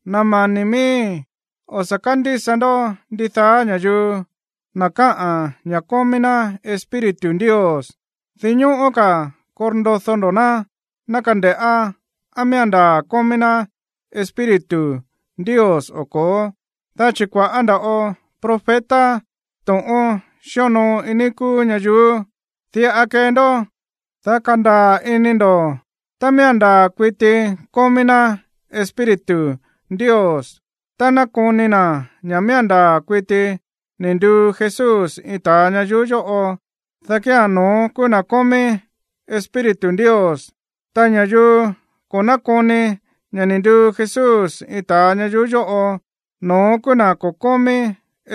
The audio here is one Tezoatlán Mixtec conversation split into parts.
Na̱ mani̱ miíi̱, o̱ sa̱ kándísa ndó ndidaá ña̱yuu, na̱ káꞌa̱n ña̱ kómí ná Espíritu Ndios. Dinñóꞌó ka̱ korndodó ndó na̱, ná kande̱ꞌá á miía̱n ndaa̱ kómí ná Espíritu Ndios o ko̱ó. Dá chi̱ kua̱ꞌá nda̱ꞌo profeta to̱ꞌón xíonoo iin níí kúú ñayuú. Diꞌa kee ndó, dá kandaa̱ ini ndo̱ tá miía̱n ndaa̱ kuiti kómí ná Espíritu Ndios: tá nákoni na̱ ña̱ miía̱n ndaa̱ kuiti ni̱ nduu Jesús iin ta̱a ñayuú yóꞌo, dá kía̱n no̱ón kúú na̱ kómí Espíritu Ndios. Ta ña̱yuu ko̱ nákoni ña̱ ni̱ nduu Jesús iin ta̱a ñayuú yóꞌo, no̱ón kúú na̱ ko̱ kómí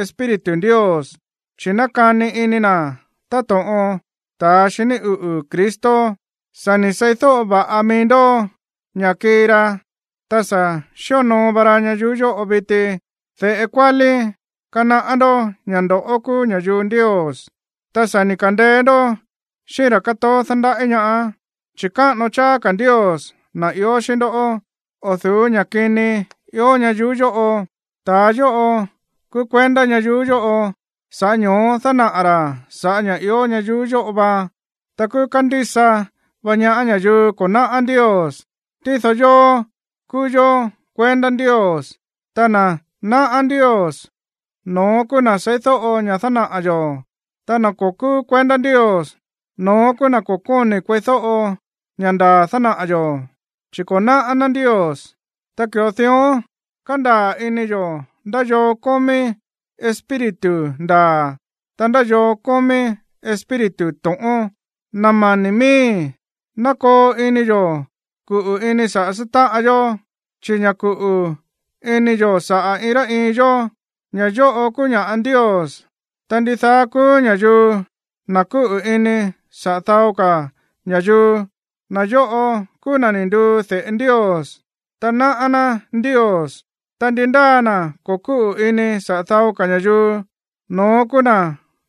Espíritu Ndios, chi̱ nákani ini na̱ táto̱ꞌon ta̱a xiní uꞌu̱ Cristo. Sa̱ ni̱ seídóꞌo vá mií ndó ña̱ kii ra, ta sa̱ xíonoo va ra ñayuú yóꞌo viti. De̱ꞌe kuálí, kanaꞌá ndó ña̱ ndoꞌó kúú ña̱yuu Ndios, ta sa̱ ni̱ ka̱ndeé ndó xíꞌín ra̱ kátoó dándaꞌí ñaá, chi̱ káꞌano cháá ka̱ Ndios, na̱ ió xíꞌín ndó, o̱ du̱ú ña̱ kini ió ñayuú yóꞌo. Ta̱a yóꞌo kúú kuendá ñayuú yóꞌo, sa̱ꞌá ño̱ó dánaꞌa̱ ra̱ sa̱ꞌá ña̱ ió ñayuú yóꞌo va. Ta kúú kándísa vá ñaá ña̱yuu ko̱ náꞌá Ndios. Tído yóó, kúú yó kuendá Ndios. Ta na̱ náꞌá Ndios, no̱ón kúú na̱ seídóꞌo ña̱ dánaꞌa̱ yo̱. Ta na̱ ko̱ kúú kuendá Ndios, no̱ón kúú na̱ ko̱ kóni̱ kueídóꞌo ña̱ ndaa̱ dánaꞌa̱ yo̱, chi̱ ko̱ náꞌá ná Ndios. Ta ki̱ꞌo dión kándaa̱ ini yo̱ ndá yoo kómí Espíritu ndaa̱, ta ndá yoo kómí espíritu to̱ꞌón. Na̱ mani̱ miíi̱, ná koo ini yo̱ kuꞌu̱ ini saꞌa̱ sátáꞌan yó, chi̱ ña̱ kuꞌu̱ ini yo̱ saꞌa̱ iin rá iin yó, ña̱ yóꞌo kúú ña̱ꞌa Ndios. Ta ndidaá kúú ña̱yuu, na̱ kúꞌu̱ ini saꞌa̱ dao ka̱ ña̱yuu, na̱ yóꞌo kúú na̱ ni̱ nduu de̱ꞌe Ndios, ta náꞌá ná Ndios. Ta ndi ndáa na̱ ko̱ kúꞌu̱ ini saꞌa̱ dao ka̱ ña̱yuu, no̱ón kúú na̱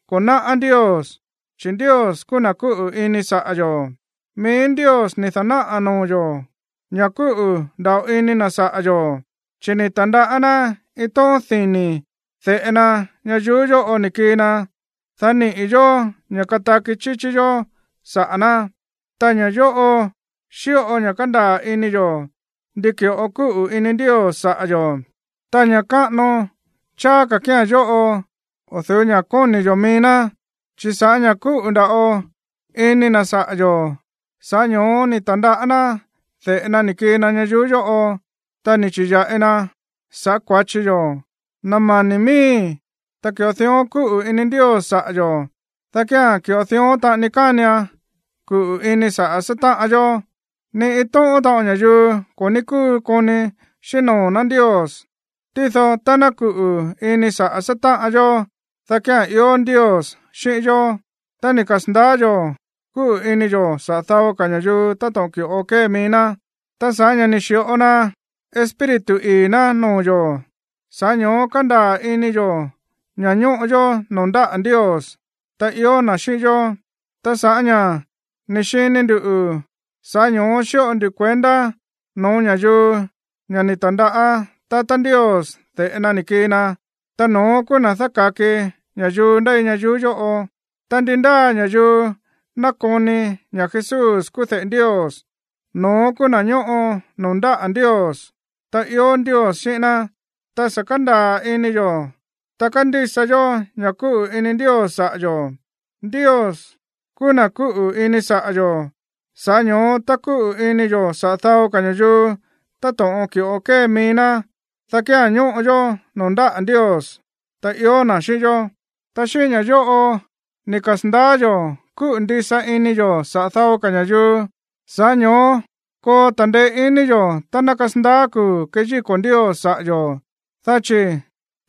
ko̱ náꞌá Ndios, chi̱ Ndios kúú na̱ kúꞌu̱ ini saꞌa̱ yo̱. Mií Ndios ni̱ da̱náꞌa̱ noo̱ yo̱ ña̱ kúꞌu̱ nda̱ꞌo ini na̱ saꞌa̱ yo̱, chi̱ ni̱ ta̱ndaꞌá ná iin tóꞌón dini̱ de̱ꞌe na ñayuú yóꞌo ni̱ kii na, dá niꞌi̱ yo̱ ña̱ kataki chíchí yó saꞌa̱ ná. Ta ña̱ yóꞌo xíꞌo ña̱ kándaa̱ ini yo̱ ndi ki̱ꞌo kúꞌu̱ ini Ndios saꞌa̱ yo̱, ta ña̱ káꞌano cháá ka̱ kía̱n yóꞌo o̱ du̱ú ña̱ kóni̱ yo̱ mií ná. Chi̱ sa̱ꞌá ña̱ kúꞌu̱ nda̱ꞌo ini na̱ saꞌa̱ yo̱, sa̱ꞌá ño̱ó ni̱ ta̱ndaꞌá ná de̱ꞌe na ni̱ kii na ñayuú yóꞌo, ta ni̱ chi̱ya̱ꞌi na sa̱ꞌá kua̱chi yó. Na̱ mani̱ miíi̱, tá ki̱ꞌo dión kúꞌu̱ ini Ndios saꞌa̱ yo̱, dá kía̱n ki̱ꞌo dión taꞌani kánian kuꞌu̱ ini saꞌa̱ sátáꞌan yó. Ni iin tóꞌón taꞌon ña̱yuu ko̱ ní kúu koni xíꞌín noo̱ ná Ndios, tído tá ná kuꞌu̱ ini saꞌa̱ sátáꞌan yó, dá kía̱n ió Ndios xíꞌín yó, ta ni̱ kasa̱ndaá yo̱ kúꞌu̱ ini yo̱ saꞌa̱ dao ka̱ ña̱yuu táto̱ꞌon ki̱ꞌo kée mií ná. Ta sa̱ꞌá ña̱ ni̱ xi̱ꞌo na Espíritu ii̱ ná noo̱ yo̱, sa̱ꞌá ño̱ó kándaa̱ ini yo̱ ña̱ ñóꞌo yó noo̱ ndáꞌa̱ Ndios, ta ió na̱ xíꞌín yó. Ta sa̱ꞌá ña̱ ni̱ xini ndu̱, sa̱ꞌá ño̱ó xíꞌo ndu kuendá noo̱ ña̱yuu ña̱ ni̱ ta̱ndaꞌá tatá Ndios de̱ꞌe na ni̱ kii na, ta no̱ón kúú na̱ dáka̱ki ña̱yuu ndéi ñayuú yóꞌo. Ta ndi ndáa ña̱yuu nákoni ña̱ Jesús kúú de̱ꞌe Ndios, no̱ón kúú na̱ ñóꞌo noo̱ ndáꞌa̱ Ndios, ta ió Ndios xíꞌín ná. Ta sa̱ kándaa̱ ini yo̱, ta kándísa yó ña̱ kúꞌu̱ ini Ndios saꞌa̱ yo̱. Ndios kúú na̱ kúꞌu̱ ini saꞌa̱ yo̱. Sa̱ꞌá ño̱ó tá kúꞌu̱ ini yo̱ saꞌa̱ dao ka̱ ña̱yuu táto̱ꞌon ki̱ꞌo kée mií ná, dá kía̱n ñóꞌo yó noo̱ ndáꞌa̱ Ndios, ta ió na̱ xíꞌín yó. Ta xíꞌín ña̱ yóꞌo ni̱ kasa̱ndaá yo̱ kúꞌu̱ ndisa ini yo̱ saꞌa̱ dao ka̱ ña̱yuu, sa̱ꞌá ño̱ó koo ta̱ndeé iní yo̱ tá ná kasandaá kuu̱ keyíko̱ Ndios saꞌa̱ yo̱, dá chi̱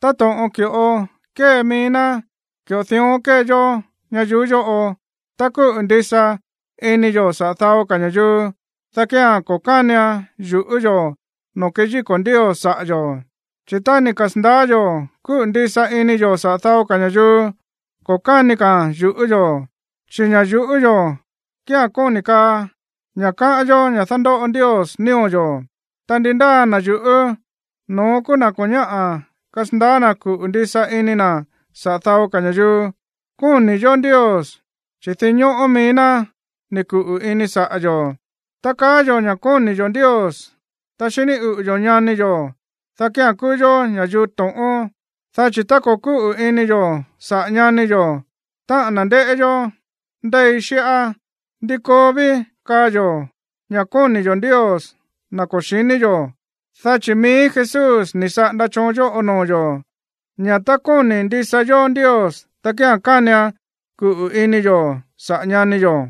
táto̱ꞌon ki̱ꞌo kée mií ná, ki̱ꞌo dión kée yó ñayuú yóꞌo. Tá kúꞌu̱ ndisa ini yo̱ saꞌa̱ dao ka̱ ña̱yuu, dá kían ko̱ kánian yu̱ꞌú yo̱ noo̱ keyíko̱ Ndios saꞌa̱ yo̱. Chi̱ tá ni̱ kasa̱ndaá yo̱ kúꞌu̱ ndisa ini yo̱ saꞌa̱ dao ka̱ ña̱yuu, ko̱ káni ka̱a̱n yu̱ꞌú yo̱. Chi̱ ña̱ yu̱ꞌú yo̱ kíán kóni̱ kaa ña̱ káꞌán yó ña̱ dándóꞌo Ndios nío̱ yo̱. Ta ndi ndáa na̱ yuꞌú, no̱ón kúú na̱ ko̱ ñáꞌa̱ kasandaá na̱ kuꞌu̱ ndisa ini na̱ saꞌa̱ dao ka̱ ña̱yuu. Kóni̱ yo̱ Ndios, chi̱ dinñóꞌó mií ná ni̱ kuꞌu̱ ini saꞌa̱ yo̱. Tá kaá yo̱ ña̱ kóni̱ yo̱ Ndios, ta xiní uꞌu̱ yo̱ ñani yo̱, dá kía̱n kúú yó ña̱yuu to̱ꞌón. Dá chi̱ tá ko̱ kúꞌu̱ ini yo̱ saꞌa̱ ñani yo̱, táꞌa̱n na̱ ndéꞌé yó ndéi xíꞌá, ¿ndi koo ví kaa yo̱ ña̱ kóni̱ yo̱ Ndios, na̱ ko̱ xíni yo̱? Dá chi̱ mií Jesús ni̱ saꞌanda choon yóꞌo noo̱ yo̱, ña̱ tá kóni̱ ndisa yó Ndios, dá kía̱n kánian kuꞌu̱ ini yo̱ saꞌa̱ ñani yo̱.